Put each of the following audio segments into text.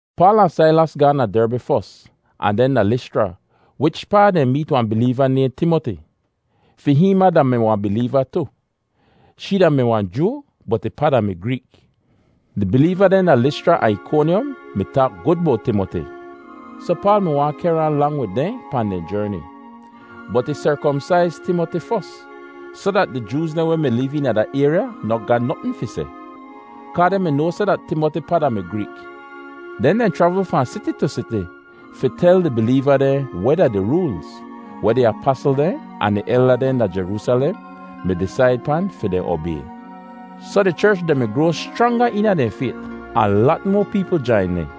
Paal ahn Sailas gaahn da Derbi fos ahn den da Lischra wichpaa dehn meet wahn bileeva weh nayhn Timoti. Fi hihn ma da-mi wahn bileeva tu. Shee da-mi Joo bot ih pa da-mi Greek. Di bileeva dehn da Lischra ahn Ikonyom mi taak gud bowt Timoti, soh Paal mi waahn kehr ahn lang wid dehn pahn dehn jerni. Bot ih serkomsaiz Timoti fos soh dat di Jooz dehn weh mi liv eena da ayrya noh ga notn fi seh, kaa dehn mi noa seh dat Timoti pa da-mi Greek. Den dehn chravl fahn siti tu siti fi tel di bileeva dehn weh da di roolz weh di apasl dehn ahn di elda dehn da Jeroosalem mi disaid pan fi dehn obay. Soh di cherch dehn mi groa schranga eena dehn fayt ahn lat moa peepl jain dehn.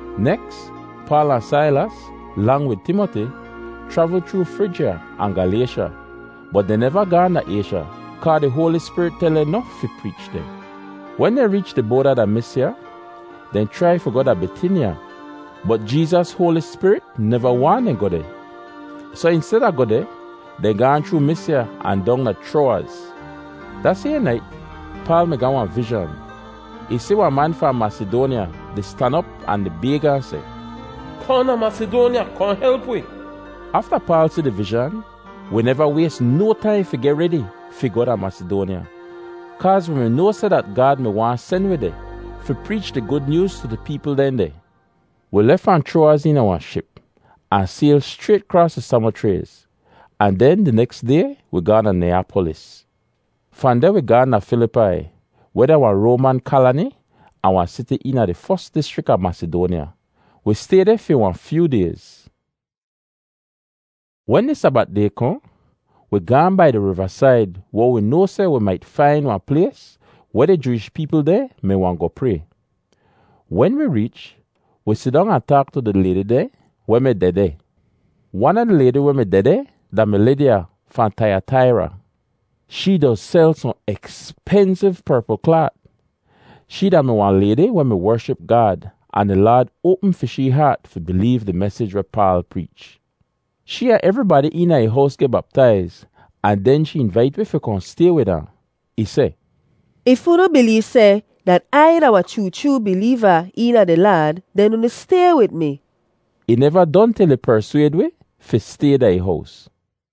Neks Paal ahn Sailas, lang wid Timoti, chravl chroo Frijya ahn Galaysha, bot dehn neva gaahn da Aysha kaa di Hoali Spirit tel dehn noh fi preech deh. Wen dehn reech di boada da Misya, dehn chrai fi goh da Bitinya, bot Jeezas Hoali Spirit neva waahn dehn goh deh. Soh insteda goh deh, dehn gaahn chroo Misya ahn dong da Chroawaz. Da sayhn nait Paal mi ga wahn vizhan. Ih si wahn man fahn Masidoanya di stan op ahn di bayg ahn seh, “Kohn da Masidoanya, kohn help wi.” Afta Paal si di vizhan, wi neva ways no taim fi geh redi fi goh da Masidoanya, kaaz wi mi noa seh dat da Gaad mi-di sen wi deh fi preech di Gud Nyooz tu di peepl dehn deh. Wi lef fahn Chroawaz eena wahn ship ahn sayl schrayt kraas tu Samochrays, ahn den di neks day wi gaahn da Niyapolis. Fahn deh wi gaahn da Filipai, weh da wahn Roaman kalani ahn wahn siti eena di fos dischrik a Masidoanya. Wi stay deh fi wahn fyoo dayz. Wen di Sabat day kohn, wi gaahn bai di rivasaid weh wi noa seh wi mait fain wahn plays weh di Jooish peepl dehn mi wahn goh pray. Wen wi reech, wi sidong ahn taak tu di laydi dehn weh mi dehdeh. Wan a di laydi weh mi dehdeh da-mi Lidya, fahn Taiyataira. Shee doz sel sohn ekspensiv perpl klaat. Shee da-mi wahn laydi weh wership Gaad ahn di Laad oapm fi shee haat fi bileev di mesij weh Paal preech. Shee ahn evribadi eena ih hows geh baptaiz ahn den shee invait wi fi kohn stay wid ahn. Ih seh, “If unu bileev seh dat Ai da wahn chroo chroo bileeva eena di Laad, den unu stay wid mi.” Ih neva don til ih perswayd wi fi stay da ih hows.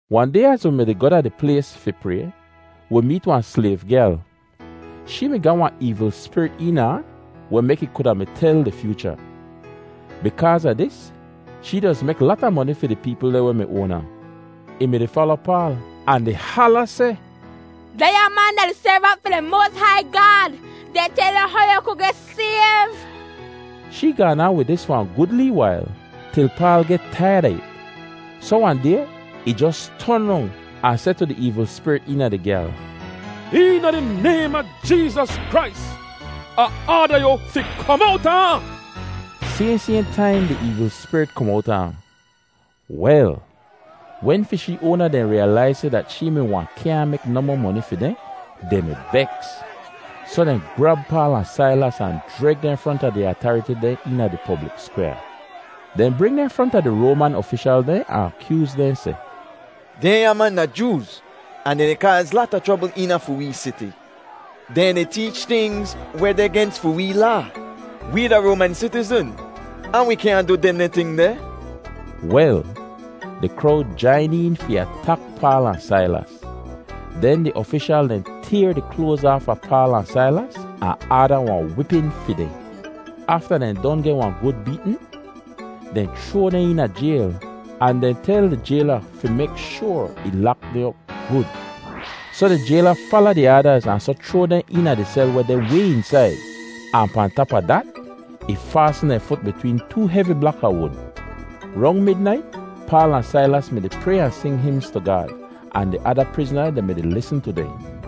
Wahn day az wi mi-di goh da di plays fi pray, wi meet wahn slayv gyal. Shee mi ga wahn eevl spirit eena ahn weh mek ih kuda mi tel di fyoocha. Bikaaz a dis, shee doz mek lata moni fi di peepl dehn weh mi oan ahn. Ih mi-di fala Paal ahn di hala seh, “Dehnya man da di servant fi di moas hai Gaad! Dehn tel yu how yu ku geh sayv.” Shee gaan aan wid dis fi wahn gud lee wail, til Paal geh taiyad a it. Soh wahn day, ih jos ton rong ahn seh tu di spirit eena di gyal, “Eena di naym a Jeezas Krais, Ah aada yu fi kom owta ahn!” Sayhn sayhn taim di eevl spirit kom owta ahn. Wel, wen fi shee oana dehn riyalaiz seh dat shee wahn kyaahn mek nohmoh moni fi dehn, dehn mi beks. Soh dehn grab Paal ahn Sailas ahn jreg dehn fronta di atariti dehn eena di poblik skwyaa. Dehn bring dehn fronta di Roaman ofishal dehn ahn akyooz dehn seh, “Dehnya man da Jooz, ahn dehn di kaaz lata chrobl eena fi wee siti. Dehn di teech tingz weh deh gens fi wee laa; wee da Roaman sitizn ahn wi kyaahn du dehndeh ting deh.” Wel, di krowd jain een fi atak Paal ahn Sailas. Den di ofishal dehn tayr di kloaz aafa Paal ahn Sailas ahn aada wahn wipin fi dehn. Afta dehn don geh wahn gud beetn, dehn chroa dehn eena jayl ahn dehn tel di jayla fi mek shoar ih lak dehn op gud. Soh di jayla fala di aadaz ahn soh chroa dehn eena di sel weh deh way eensaid, ahn pahn tap a dat, ih faasn dehn fut bitween too hevi blak a wud. Rong midnait Paal ahn Sailas mi-di pray ahn sing himz tu Gaad, ahn di ada prizna dehn mi-di lisn tu dehn.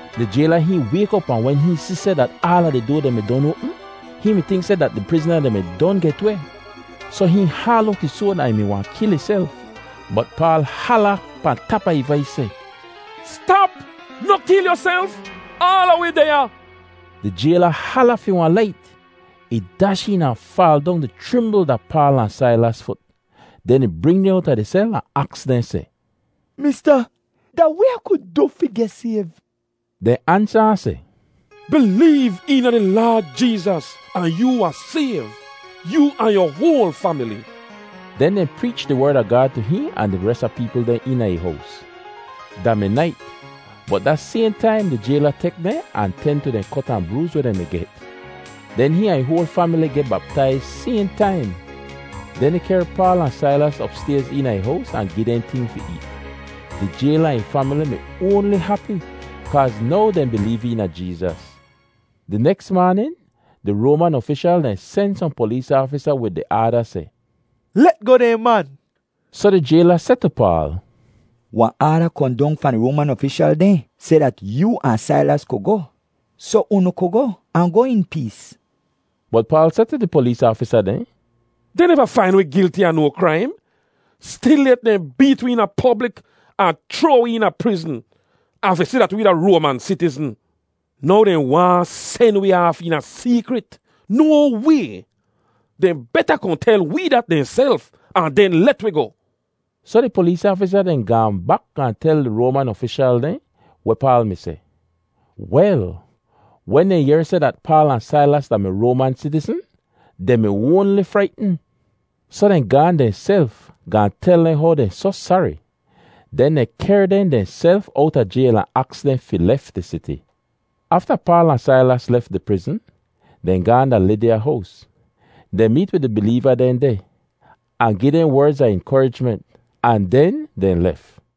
Di jayla hihn wayk op ahn wen hihn si seh dat aala di doa dehn oapm, hihn mi tink seh dat di prizna dehn mi don get weh; soh hihn haal owt ih soad ahn ih mi wahn kil ihself. Bot Paal hala pahn di tap a ih vais seh, “Stap, noh kil yuself! Aala wi deh ya!” Di jayla hala fi wahn lait, ih dash een ahn faal dong di chrimbl da Paal ahn Sailas fut. Den ih bring dehn owta di sel ahn aks dehn seh, “Mista, da weh Ah ku du fi geh sayv?” Dehn ansa ahn seh, “Bileev eena di Laad Jeezas ahn yoo wahn sayv—yoo ahn yu hoal famili.” Den dehn preech di Werd a Gaad tu hihn ahn di res a di peepl dehn eena ih hows. Da mi nait, bot da sayhn taim di jayla tek dehn ahn ten tu di kot ahn brooz weh dehn mi get; den hihn ahn ih hoal famili geh baptaiz sayhn taim. Den ih kehr Paal ahn Sailas opstayz eena ih hows ahn gi dehn ting fi eet. Di jayla ahn ih famili mi oanli hapi kaaz now dehn bileev eena Jeezas. Di neks maanin di Roaman ofishal dehn sen sohn polees aafisa wid di aada seh, “Let goh dehn man.” Soh di jayla seh tu Paal, “Wahn aada kohn fahn di Roaman ofishal dehn seh dat yoo ahn Sailas ku goh. Soh unu ku goh, ahn goh in pees.” Bot Paal seh tu di polees aafisa dehn, “Dehn neva fain wi gilti a no kraim. Stilyet dehn beet wi eena poblik ahn chroa wi eena prizn, ahn fi si dat wee da Roaman sitizn. Now dehn waahn sen wee aaf eena seekrit. No way! Dehn beta kohn tel wee dat dehnself ahn den let wi goh.” Soh di polees aafisa dehn gaahn bak gaahn tel di Roaman ofishal dehn weh Paal mi seh. Wel, wen dehn yehr seh dat Paal ahn Sailas da-mi Roaman sitizn, dehn mi oanli fraitn. Soh dehn gaahn dehnself gaahn tel dehn how dehn soh sari; den dehn kehr dehn dehnself owta jayl ahn aks dehn fi lef di siti. Afta Paal ahn Sailas lef di prizn, dehn gaahn da Lidya hows. Dehn meet wid di bileeva dehn deh, ahn gi dehn werdz a inkorijment, ahn den dehn lef.